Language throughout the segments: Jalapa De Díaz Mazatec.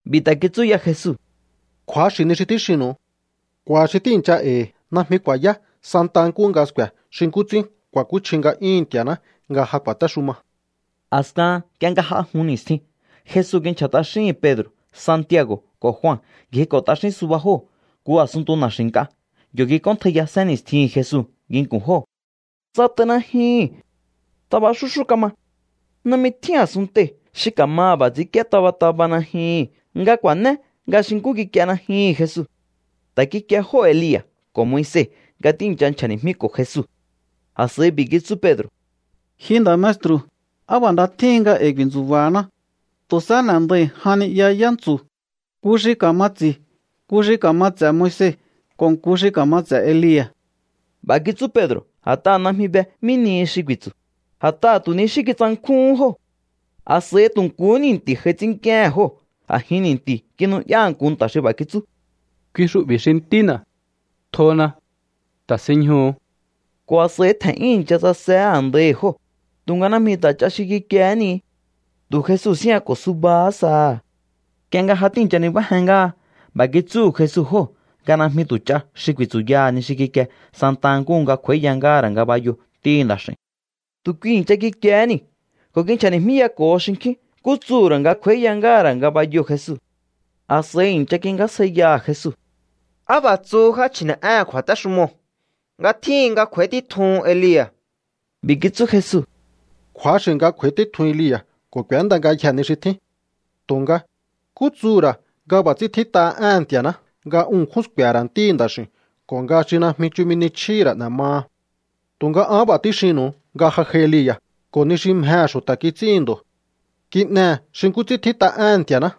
B'i̱ ta̱ kitsú ya Jesu: —Kju̱axi̱ ni xi tíxinnu̱u. K'u̱a̱ xi tíi̱ncha e̱i̱ najmi ku̱a̱yá santa nkúhu nga sku̱e̱ xi nkú ts'ín ku̱a̱kúchji nga'yúhu̱n Nti̱a̱ná nga ja ku̱a̱téxuma. A̱skahan nk'ie nga j'a jun ni̱stjin, Jesu kinchja̱ t'axíhi̱n Pedro̱, Santiago̱ ko̱ Jua. Ngjiko̱ t'axín suba jóo̱ nku a̱sunntu na̱xi̱ nk'a. Yo̱ kik'óntjaiya sénni̱stjihi̱n Jesu nginku̱n jóo̱. Tsat'ai najyuhu̱n. Taba xúxú kama. Najmi tjín a̱sunntei̱ xi ka̱maha̱ b'a̱ ts'i̱ínk'íé taba taba najyuhu̱n nga ku̱a̱né nga xi nkú kik'ie najyuhu̱n Jesu. Ta̱ kikie jóo̱ Elia̱ ko̱ Moise nga tíi̱ncha nchja̱ni̱jmíko̱ Jesu. A̱s'a̱i b'i̱ kitsú Pedro̱: —Ji nda̱ maestru̱, ¡á b'a̱ nda tjíhin nga e̱i̱ ku̱i̱ntsu̱ba̱haná! Tu̱ sahá n'e̱ndai̱ jan ni'ya yántsu̱, nku xi ka̱ma ts'i̱, nku xi ka̱ma ts'e̱ Moise, ko̱ nku xi ka̱ma ts'e̱ Elia̱. B'a̱ kitsú Pedro̱ a̱t'aha̱ najmi be mí nihi xi ku̱i̱tsu̱, a̱t'aha̱ tu̱ ni xí kitsankjúhún jóo̱. A̱s'a̱i tu̱ nkuhú ni̱nti̱ j'ai ts'ínnk'íéhe̱n ko̱ a̱jin ni̱nti̱u̱ kinu'yá nku nta̱ xi b'a̱ kitsú: —Kui xu'bi̱ xi Ntína̱. Tjona. Ta̱sinñjuhu̱u. Ko̱ a̱s'a̱i tje̱n'yún i̱ncha tsasehé a̱ndaihi̱ jóo̱, tu̱nga najmi ta̱ ch'a xi kikiehé ni. Tu̱ Jesu síjñako̱ subahá saha̱. Nk'ie nga ja tíi̱ncha nibájen ngáha, b'a̱ kitsúhu̱ Jesu jóo̱ nga najmi tu̱ ch'a xi ku̱i̱tsu̱yaha̱ ni xi kikie santa nkúhu nga kj'u̱a̱íya ngáha̱ ra̱ ngabayoo̱ Ntíhi̱ Nda̱x'i̱u̱n. Tu̱ kui i̱ncha kikiehé niu̱ ko̱ kinchja̱ni̱jmíyako̱ho xinkjín nkú tsuhu̱ ra̱ nga kj'u̱a̱íya ngáha̱ ra̱ ngabayoo̱ Jesu. A̱s'a̱i i̱ncha kingjásjaiyaha̱ Jesu: —¿Á b'a̱ tsuhu já chji̱ne̱'éhe̱n kju̱a̱téxumoo̱ nga tjíhin nga kj'u̱a̱í títjuhun Elia̱? B'i̱ kitsú Jesu: —Kju̱axi̱ nga kj'u̱a̱í títjun Elia̱ ko̱ k'u̱énda ngayjee̱ ni xi tjín. Tu̱nga, ¿nkú tsuhu̱ ra̱ nga b'a̱ ts'ín tjít'aha éhe̱n Nti̱a̱ná nga un ṉkjún sku̱e̱he̱ ra̱ Ntíhi̱ Nda̱x'i̱u̱n ko̱ nga xi najmi chumi ni chjíhi̱ ra̱ n'e̱ maha? Tu̱nga an b'a̱ tíxinnu̱u nga ja j'ai Elia̱, ko̱ ni xi mjehe̱ xu̱ta̱ kits'íhi̱n ndo̱. Kin'ehe̱ xi nkú ts'ín tjít'a éhe̱n Nti̱a̱ná.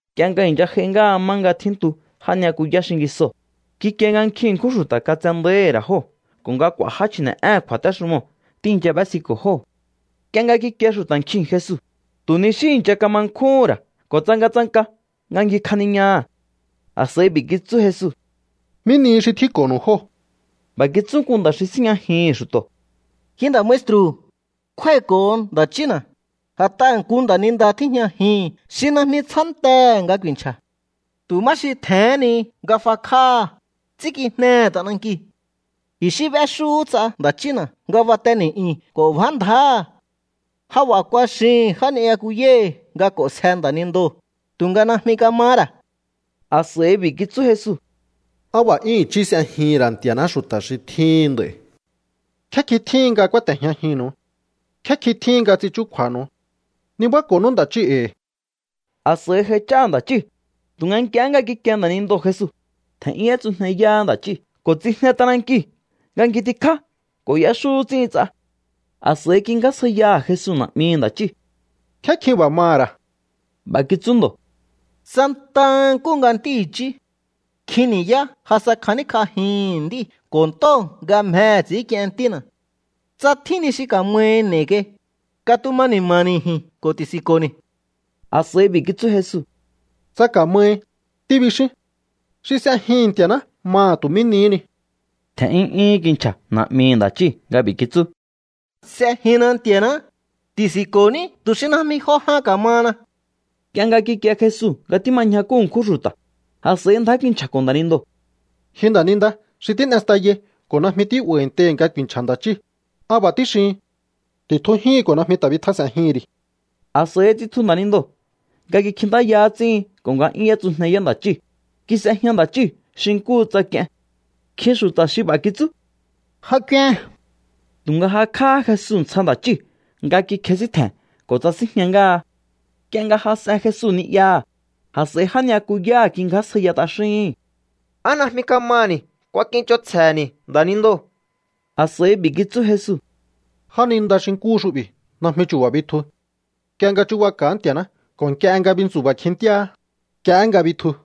Nk'ie nga i̱ncha j'ai ngáha má nga tjíntu já ni'yakuyá xingisoo̱, kikie nga nkjin ṉkjún xu̱ta̱ katsendáíhi̱ ra̱ jóo̱ ko̱ nga k'u̱a̱ já chji̱ne̱'éhe̱n kju̱a̱téxumoo̱ tíi̱ncha b'ésiko̱ jóo̱. Nk'ie nga kikie xu̱ta̱ nkjiu̱n Jesu, tu̱ ni xí i̱ncha kama nkjúhún ra̱ ko̱ tsangatsanka nga ngjikjaniñaha̱. A̱s'a̱i b'i̱ kitsú Jesu: —¿Mí nihi xi tjínko̱ho̱nu̱u jóo̱? B'a̱ kitsú nku nda̱ xi síjñajihi̱n xu̱to̱: —Ji nda̱ maestru̱, kjúái̱ko̱ho nda̱ chína̱, a̱t'aha̱ nku nda̱ninda tíjñajihi̱n xi najmi tsjántehe̱ nga ku̱i̱nchja̱. Tu̱ má xi tje̱hén ni nga fakj'áha̱, ts'ínkijnehe̱ t'anankiu̱. I̱xí b'éxúhú ts'a nda̱ chína̱ nga bate ni̱'yu̱n ko̱ bjá ndjáha̱. Ja b'a̱ kuaxihi̱n já ni'yakuyáhi̱ nga k'o̱nsje nda̱nindoo̱, tu̱nga najmi kamahá ra̱. A̱s'a̱i b'i̱ kitsú Jesu: —¡Á b'a̱ 'yún i̱chí s'ejihi̱n ra̱ Nti̱a̱ná xu̱ta̱ xi tjíhin nd'a̱i̱! ¿Nkjé kjin tjíhin nga kúáte̱jñajinnu̱u? ¿Nkjé kjin tjíhin nga ts'in chúkju̱a̱nu̱u? Nibáko̱nú nda̱ chíu̱ e̱i̱. A̱s'a̱i j'aich'áha̱ nda̱ chíu̱. Tu̱nga nk'ie nga kikie nda̱nindoo̱ Jesu, tje̱n'yún y'étsujneyáhá nda̱ chíu̱ ko̱ tsijne t'anankiu̱ nga ngjitikjá ko̱ y'éxú ts'íhin ts'a. A̱s'a̱i kingjásjaiyaha̱ Jesu na̱'mihi̱ nda̱ chíu̱: —¿Nkjé kjin b'a̱ maha̱ ra̱? B'a̱ kitsú ndo̱: —Santa nkúhu nga ntí i̱chí. Nkjin ni̱yá ja sa kjaníkj'ajihi̱n nd'íu̱ ko̱ ntóo̱ nga mjehe̱ ts'i̱ínk'ien ntína̱. Tsa tjín ni xi ka̱mahi n'e̱i̱ kai, katuma ni̱ma̱ni̱ ji̱n ko̱ ti̱si̱nko̱ni̱. A̱s'a̱i b'i̱ kitsú Jesu: —“Tsa ka̱mahi”, tíbixín. Xi s'ejihi̱n Nti̱a̱ná maha̱ tu̱ mí nihí ni. Tje̱n'yún 'yúhún kinchja̱ na̱'mihi̱ nda̱ chíu̱ nga b'i̱ kitsú: —S'ejinna Nti̱a̱ná. Ti̱si̱nko̱ní tu̱ xi najmi jo jan ka̱mahana. Nk'ie nga kikie Jesu nga tíma ñjakú ṉkjún xu̱ta̱, a̱s'a̱i ndjá kinchja̱ko̱ nda̱nindoo̱: —Ji nda̱ninda xi tín'e stayai ko̱ najmi tí'ba̱i̱ntei̱hi̱ nga ku̱i̱nchja̱ nda̱ chíi̱, an b'a̱ tíxihin: ti̱tjujíhi̱n ko̱ najmi ta̱ bitjas'e̱njihi̱n ri̱. A̱s'a̱i tsitju nda̱nindoo̱ nga kikjintáya ts'íhin ko̱ nga 'yún y'étsujneyá nda̱ chíu̱. Kis'ejña nda̱ chíu̱ xi nkúhu tsa k'ien. Nkjin xu̱ta̱ xi b'a̱ kitsú: —Ja k'uen. Tu̱nga jakj'áhá Jesu ntsja nda̱ chíu̱ nga kikjesíntje̱n ko̱ tsasinjña ngáha. Nk'ie nga jas'en Jesu ni'yaha̱, a̱s'a̱i já ni'yakuyáha̱ kingjásjaiya t'axíhi̱n: —¿Á najmi kamaha̱ni̱ kuakich'onsje̱he̱ni̱ nda̱nindoo̱? A̱s'a̱i b'i̱ kitsú Jesu: —Jáninda xi nkúhu xu'bi̱ najmi chu̱ba̱ bitju. Nk'ie nga chu̱baka̱á Nti̱a̱ná ko̱ nk'ie nga bintsu̱ba̱ kjintíaá, nk'iehé nga bitju.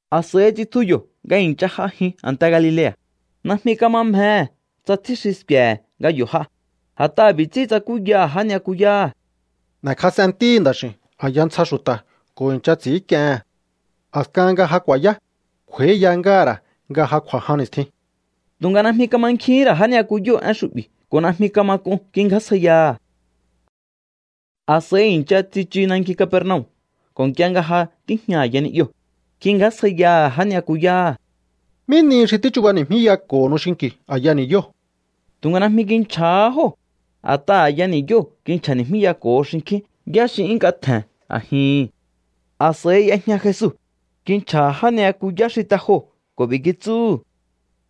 A̱s'a̱i tsitju yo̱ nga i̱ncha j'ajin a̱nte Galilea̱. Najmi kama mjehe̱ tsa tjín xi sku̱e̱he̱ nga yo̱ j'a, a̱t'aha̱ b'i̱ ts'ín tsakúyaha̱ já ni'yakuyáha̱: —N'e̱kjas'en Ntíhi̱ Nda̱x'i̱u̱n a̱ya ntsja xu̱ta̱ ko̱ i̱ncha ts'i̱ínk'iehe̱n. A̱skahan nga ja ku̱a̱yá, kj'u̱a̱íya ngáha̱ ra̱ nga ja kj'u̱a̱ jan ni̱stjin. Tu̱nga najmi kamankjihín ra̱ já ni'yakuyóo̱ én xu'bi̱ ko̱ najmi kama k'un kingjásjaiyaha̱. A̱s'a̱i i̱ncha tsichu nanki Capernaum ko̱ nk'ie nga ja tíjña a̱ya ni'yoo̱, kingjásjaiyaha̱ já ni'yakuyáha̱: —¿Mí nihi xi tíchubani̱jmíyako̱honu xinki̱u a̱ya ni̱yóo̱? Tu̱nga najmi kinchja̱há jóo̱, a̱t'aha̱ a̱ya ni̱yóo̱ kinchja̱ni̱jmíyako̱ho xinkjín yá xi 'yún nk'a tje̱n a̱jihi̱n. A̱s'a̱i y'ejña Jesu, kinchja̱ha̱ já ni'yakuyá xi te joo̱ ko̱ b'i̱ kitsúhu̱: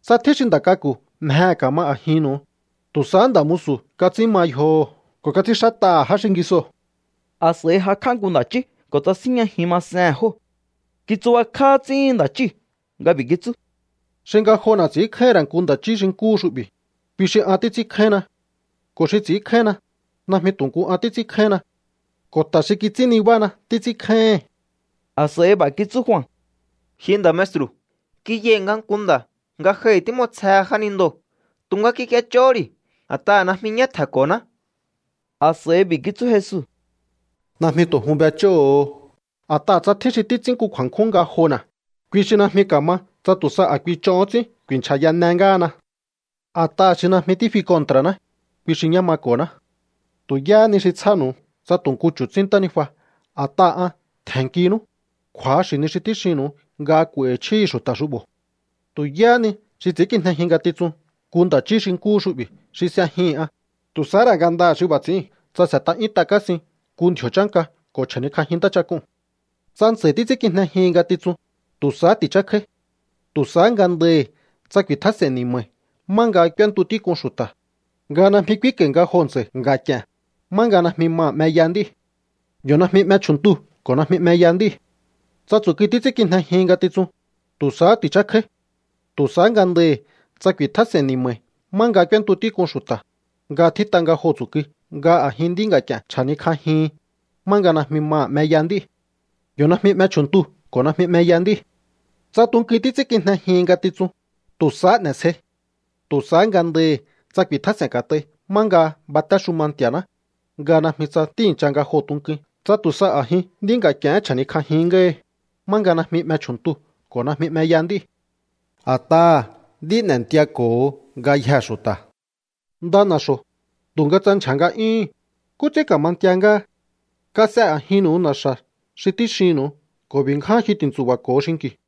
—Tsa tjín xi nda̱ k'aku̱ mjehe̱ ka̱ma a̱jinnu̱u, tu̱ sahá nda̱ musu̱ kats'ín ma yjoho̱ ko̱ kats'ínxát'aha̱ já xingisoo̱. A̱s'a̱i jakj'á nku nda̱ chí ko̱ tsasínjñajin masehe̱n jóo̱. Kitsubakjá ts'íhin nda̱ chíu̱ nga b'i̱ kitsú: —Xi ngajona̱ ts'i̱ínkjáíhi̱n ra̱ nku nda̱ chí xi nkúhu xu'bi̱, kui xi an títs'ínkjáínna. Ko̱ xi ts'i̱ínkjáínna, najmi tu̱ nku an títs'ínkjáínna. Ko̱ ta̱ xi kits'ín nibána títs'ínkjáíhi̱n. A̱s'a̱i b'a̱ kitsú Jua: —Ji nda̱ maestru̱, kiyai̱ nga nku nda̱ ngajohi̱ tím'osjehe jánindoo̱. Tu̱nga kik'iech'ohó ri̱ a̱t'aha̱ najmi ñá tje̱nko̱ná. A̱s'a̱i b'i̱ kitsú Jesu: —Najmi tu̱ jun b'ech'óho̱o. A̱t'aha̱ tsa tjín xi títs'ín nku kju̱a̱nkjún ngajona̱, kui xi najmi ka̱ma tsa tu̱ sa a̱ kui ch'ohón ts'ín ku̱i̱nchja̱yane ngáhana. A̱t'aha̱ xi najmi tífi kontra̱ná, kui xi ñá mako̱ná. Tu̱ yáhá ni xi tsjánu̱u tsa tu̱ nku chu̱tsín ntánijua a̱t'aha̱ an tje̱nnkinú, kju̱axi̱ ni xi tíxinnu̱u nga k'u̱a̱i̱hi̱ chjíhi̱ xu̱ta̱ xu'bo̱. ’Tu̱ yáhá ni xi ts'i̱ínkijnejin ngatitsun nku nda̱ chí xi nkúhu xu'bi̱ xi s'ejihi̱n an, tu̱ sahá ra̱ ngandaha̱ xi b'a̱ ts'i̱íu̱n tsa s'e̱t'a 'yúnt'a kásin nku ndji̱o̱ chánka ko̱ chja̱nikj'ajin ntáchak'uu̱n. Tsa ntsa̱i̱ títs'ínkijnejihin ngatitsun, tu̱ sahá ti̱chákjáí. Tu̱ sahá ngandahi̱ tsa ku̱i̱tjás'e̱n ni̱ma̱i̱ má nga k'úéntu tík'un xu̱ta̱, nga najmi k'úínko̱i̱ nga joo̱ ntsa̱i̱ nga̱k'i̱e̱n, má nga najmi maha̱ 'meya nd'íu̱. Yo̱ najmi 'me chju̱ntuu̱ ko̱ najmi 'meya nd'íu̱. ’Tsa tsu̱kui títs'ínkijnejihin ngatitsun, tu̱ sahá ti̱chákjáí. Tu̱ sahá ngandahi̱ tsa ku̱i̱tjás'e̱n ni̱ma̱i̱ má nga k'úéntu tík'un xu̱ta̱, nga tjít'a nga joo̱ tsu̱kui nga a̱jin nd'í nga̱k'i̱e̱n chja̱nikj'ajihin, má nga najmi maha̱ 'meya nd'íu̱. Yo̱ najmi 'me chju̱ntuu̱ ko̱ najmi 'meya nd'íu̱. ’Tsa tunkuin títs'ínkijnejihin ngatitsun, tu̱ sahá n'e̱sjei. Tu̱ sahá ngandahi̱ tsa ku̱i̱tjás'e̱n ka̱t'ai má nga batéxuma Nti̱a̱ná, nga najmi tsa tíi̱ncha nga joo̱ tunkuin tsa tu̱ sa a̱jin nd'í nga̱k'i̱e̱hén chja̱nikj'ajin ngáhi, má nga najmi 'me chju̱ntuu̱ ko̱ najmi 'meya nd'íu̱. ’A̱t'aha̱ nd'í n'entiako̱ho ngayjee̱ xu̱ta̱. Nda na̱xo̱, tu̱nga tsa ndyja̱ nga'yúhu̱n, ¿nkú ts'ín ka̱ma ntia ngáha? Kas'e a̱jinnu̱u na̱xa̱ xi tíxinnu̱u ko̱ b'i̱ ngján jyu ti̱ntsu̱ba̱ko̱o xinki̱u.